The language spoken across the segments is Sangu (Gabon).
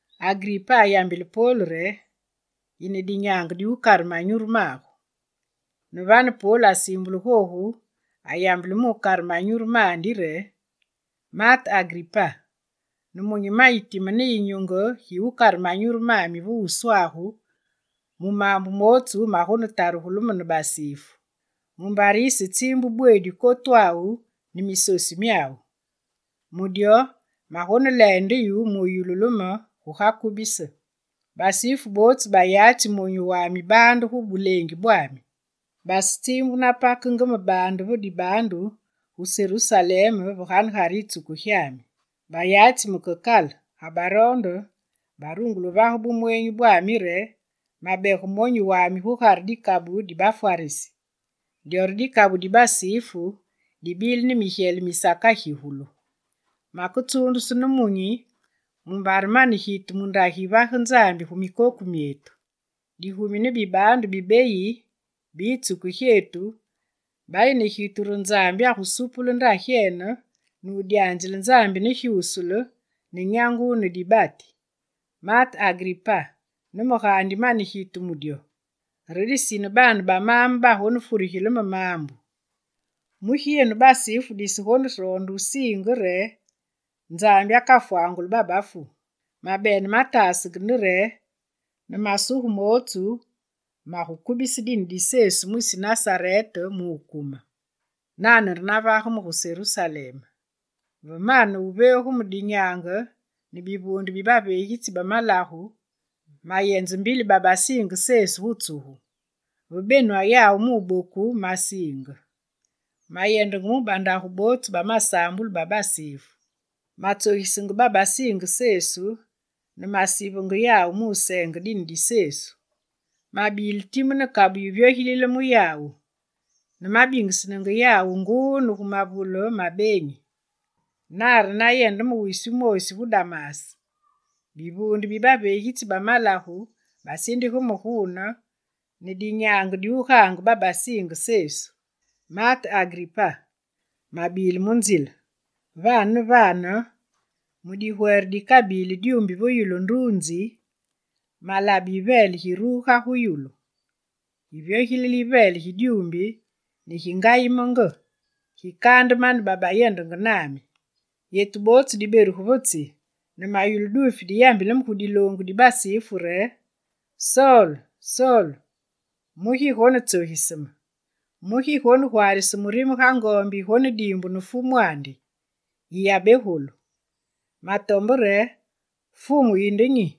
Agripa ayambile Pol re: «Yine dinyaange diwukare manyuru magu.» Ne vane Pol asiimbule googu ayambile mu wukare manyuru mandi re: «Maate Agripa, nemunyi mayi time ne yinyunge gi wukare manyuru mami ve wuswagu mu maambu mootsu magonetarugulu me ne basifu. Mumbare yisetsiimbu bweedi kotwawu ne misosu myawu. Mu dyo, magoneleende yu, yululu me guga kubise. Basifu bootsu bayatsi monyu wami baande gu buleengi bwami. Basetsiimbu napakenge me baande ve dibaandu, gu Serusalem ve ganegare yitsuku gyami. Bayatsi me ke kale, ga baroonde barungule wuvage bumweenyi re mabege monyu wami gugare dikabu di Bafwarisi: dyo re dikabu di basifu dibile ne migyele misakagigulu. Maketsuundusu nemunyi mumbare mane gitu mu ndagi yivage Nzambi gu mikoku myetu. Digumi ne bibaandu bi beyi bi yitsuku gyetu bayi ne gitu re Nzambi agusupule ndagyene, nudyanzile Nzambi ne gyusule, ne nyangu ne dibati. Maate Agripa, ne me gaandi mane gitu mu dyo. Re disine baane ba maame ba basifu bagonetarigile me maambu. Mugi yenu basifu disegoneroonde wusiinge re Nzambi akafwanguli babafu? Mabene matasenge nde re ne masuge mootsu magukubise dine di Sesu mwisi Nasarete mu wukume. Nane re navage me gu Serusalem. Ve mane wuveegu me dinyaange ne bivuunde bi baveegitsi ba malagu, mayenze mbili babasiinge Sesu gu tsugu. Ve benwa yawu wuboku masiinge. Mayendenge gu bandagu bootsu ba masaambulu ba basifu. Matsogisenge babasiinge Sesu ne masivenge yawu mu wuseenge dine di Sesu. Mabile time ne kabu yiviogilile mu yawu ne mabingisenge yawu nguu ne gu mavule ma beenyi. Nane re nayende me wisi wumoosi gu Damas. Bivuunde bi baveegitsi ba malagu basindige me guune ne dinyaange diwugaange babasinge Sesu. Maate Agripa, mabile mu nzile. Vane ne vane mu digwere dikabili dyuumbi va yulu nduunzi, malabe yiveele giruga gu yulu. Givyogilile yiveele gi dyuumbi ne gingayimenge, gikaande mane babayendenge nami. Yetu bootsu diberugu va tsi, ne mayulu duufi diyambilenge me gu diloongu di basifu re: “Sol, Sol, mugi yigonetsogise me? Mugi yigonegwaarise murime ga ngoombi yigonediimbu ne fumwandi? Yiyabegolu!” Matombe re: “Fumu, yinde nyi?”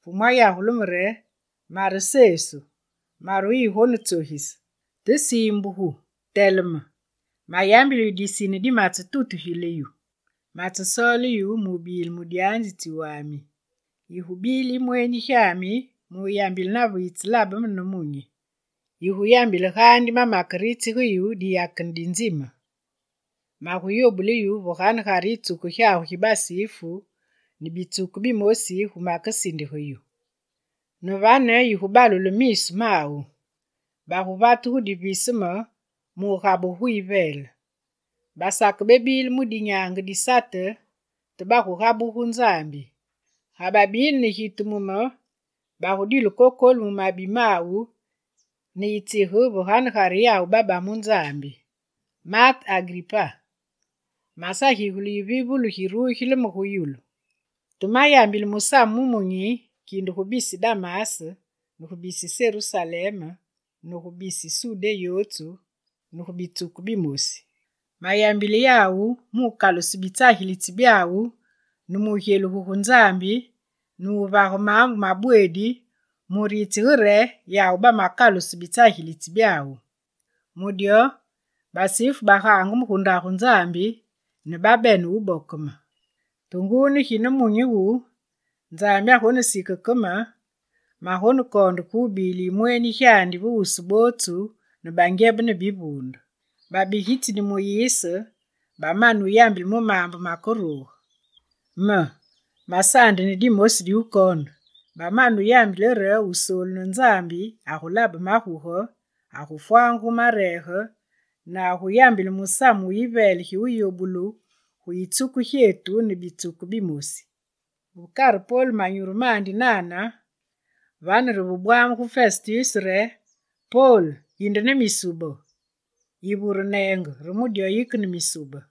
Fumu ayagule me re: “Mare Sesu, mare wuyigonetsogise. Te siimbuge, teleme! Mayambili yu disine di mamatutugile yu: matsesoole yu mu wubile mudyanzitsi wami. Yigubile yimweenyi gyami mu wuyambile nave yitselabe me nemunyi. Yiguyambile gaandi mamakeritsige yu diyakene di nzime. Maguyobule yu va ganegare yitsuku gyagu gi basifu ne bitsuku bimosi gu makesindige yu. Ne vane yigubalule miisu mawu, baguvate gu diviseme mu wugabugu gu yiveele. Basakebebile mu dinyaange di Sate, te bagugabugu gu Nzambi. Ga babile ne gitu mu me, bagudile kokolu mu mabi mawu ne yitsige vaganegare yawu baba mu Nzambi.” Maate Agripa, masagigule yivivulu girugile me gu yulu. Te mayambile musamu wumunyi kinde gu bisi Damas ne bisi Serusalem kere gu bisi Sudé yootsu ne gu bitsuku bimosi. Mayambile yawu mu wukaluse bitsagilitsi byawu ne mu wugyelugu gu Nzambi, ne mu wuvage maambu mabweedi mu wuritsige re yawu bamakaluse bitsagilitsi byawu. Mu dyo, basifu bagaange me gu Ndagu Nzambi ne babene wuboke me. Te nguu ne gi nemunyi wu, Nzambi agonesike ke me ne magonekoonde ke wubile yimweenyi gyandi ve wusu bootsu, bangyebe ne bivuunde. Babigitsi ne Muyise bamane wuyambile mu maambu makeruge, me, masaandi ne dimosi diwukoonde. Bamane wuyambile re Wusoolu ne Nzambi agulabe maguge, agufwangugu mareege ne aguyambile musamu wu yiveele gi wuyobulu gu yitsuku gyetu ne bitsuku bimosi.» Ve kare Pol manyuru mandi nane, vane re ve bwamugu Festus re: «Pol, yinde ne misube! Yivure wuneenge re mu dyo yike ne misube!»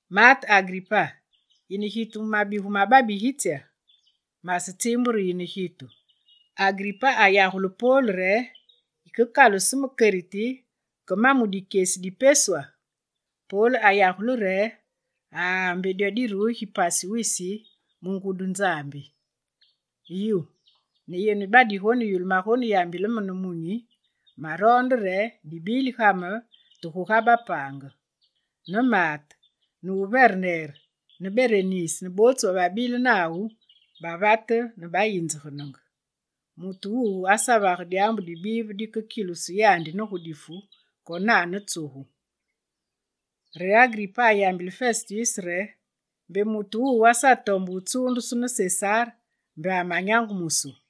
Maate Agripa, yine gitu mu mabigu ma babigitsya? Masetsiimbu re yine gitu.» Agripa ayambile Pol re: «Yikekaluse me keriti ke mu ma dikyesi di peswa?» Pol ayagule re: «Aa, mbe dyo dineruge pasi wisi mu ngudi Nzambi! Yu, ne yenu badigoneyulu magoneyambile me nemunyi, maroonde re yenu dibili ga me, te guga bapaange!» Ne maate ne muverner ne Berenis ne bootsu bababile nawu bateleme. Bavate ne bayinzegenenge: «Mutu wuwu asavage dyaambu dibive dikekilusu yandi ne difu konane tsugu.» Re Agripa ayambile festus re: «Mbe mutu wuwu asatombe wutsuundusu ne Sesar, mbe amanyangumusu.»